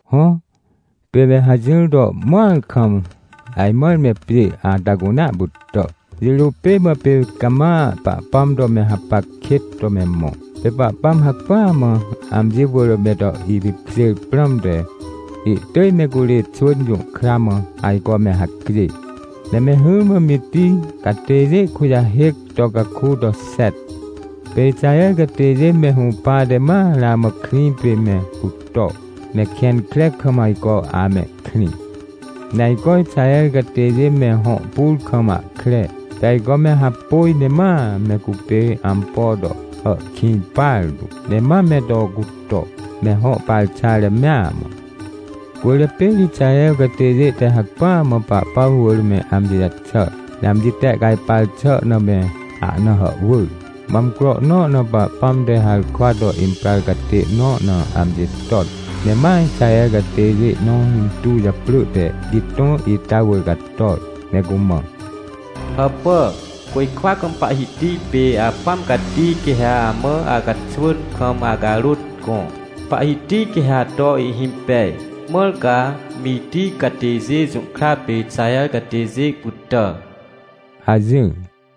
Hõ, pê me hajỹr to mõar kam, ajmãr me pjê ata cunea pytà. Jirô pêmã pê cama Pahpãm to me hapac kêt to me mõ. Pê Pahpãm hacpỹa mã amji wỳr me to ipipkjêr prãmte, ihtỳj me curê xwỳn jũhkramã ajco me hacjê, ne me hỹrmã Mitij catêjê kujahêc to caku toxet. Pê Ixaher catêjê me hũpate ma ramã krĩ pême cuto, ne kẽn kre kam ajco amehkrĩ. Neajco Ixaher catêjê me hõ pur kam ahkre, pê ajco me hapôj ne mame cupê ampo to hàhkĩj partu, ne ma me to cuto, me hõ parxare mea mã. Cwỳrjapê ri Ixaher catêjê te hacpỹamã Pahpãm wỳr me amji jaxàr, ne amjitehcajpar xà na me ahna hàhwỳr. Mã amcro nõ na Pahpãm te harkwato imprar catê nõ na amji ton, ne ma Ixaher catêjê nõ intuw japrỳ teGitõ ita wỳr cator, ne cumã: — Hàpà! Côjkwa kam Pahhiti pê Apãm Cati quê haamã acaxwỳn kam acarôt gõ. Pahhiti quê ha ato ihhimpej, mãr ca Mitij catêjê jũhkra pê Ixaher catêjê pytà — hajỹr.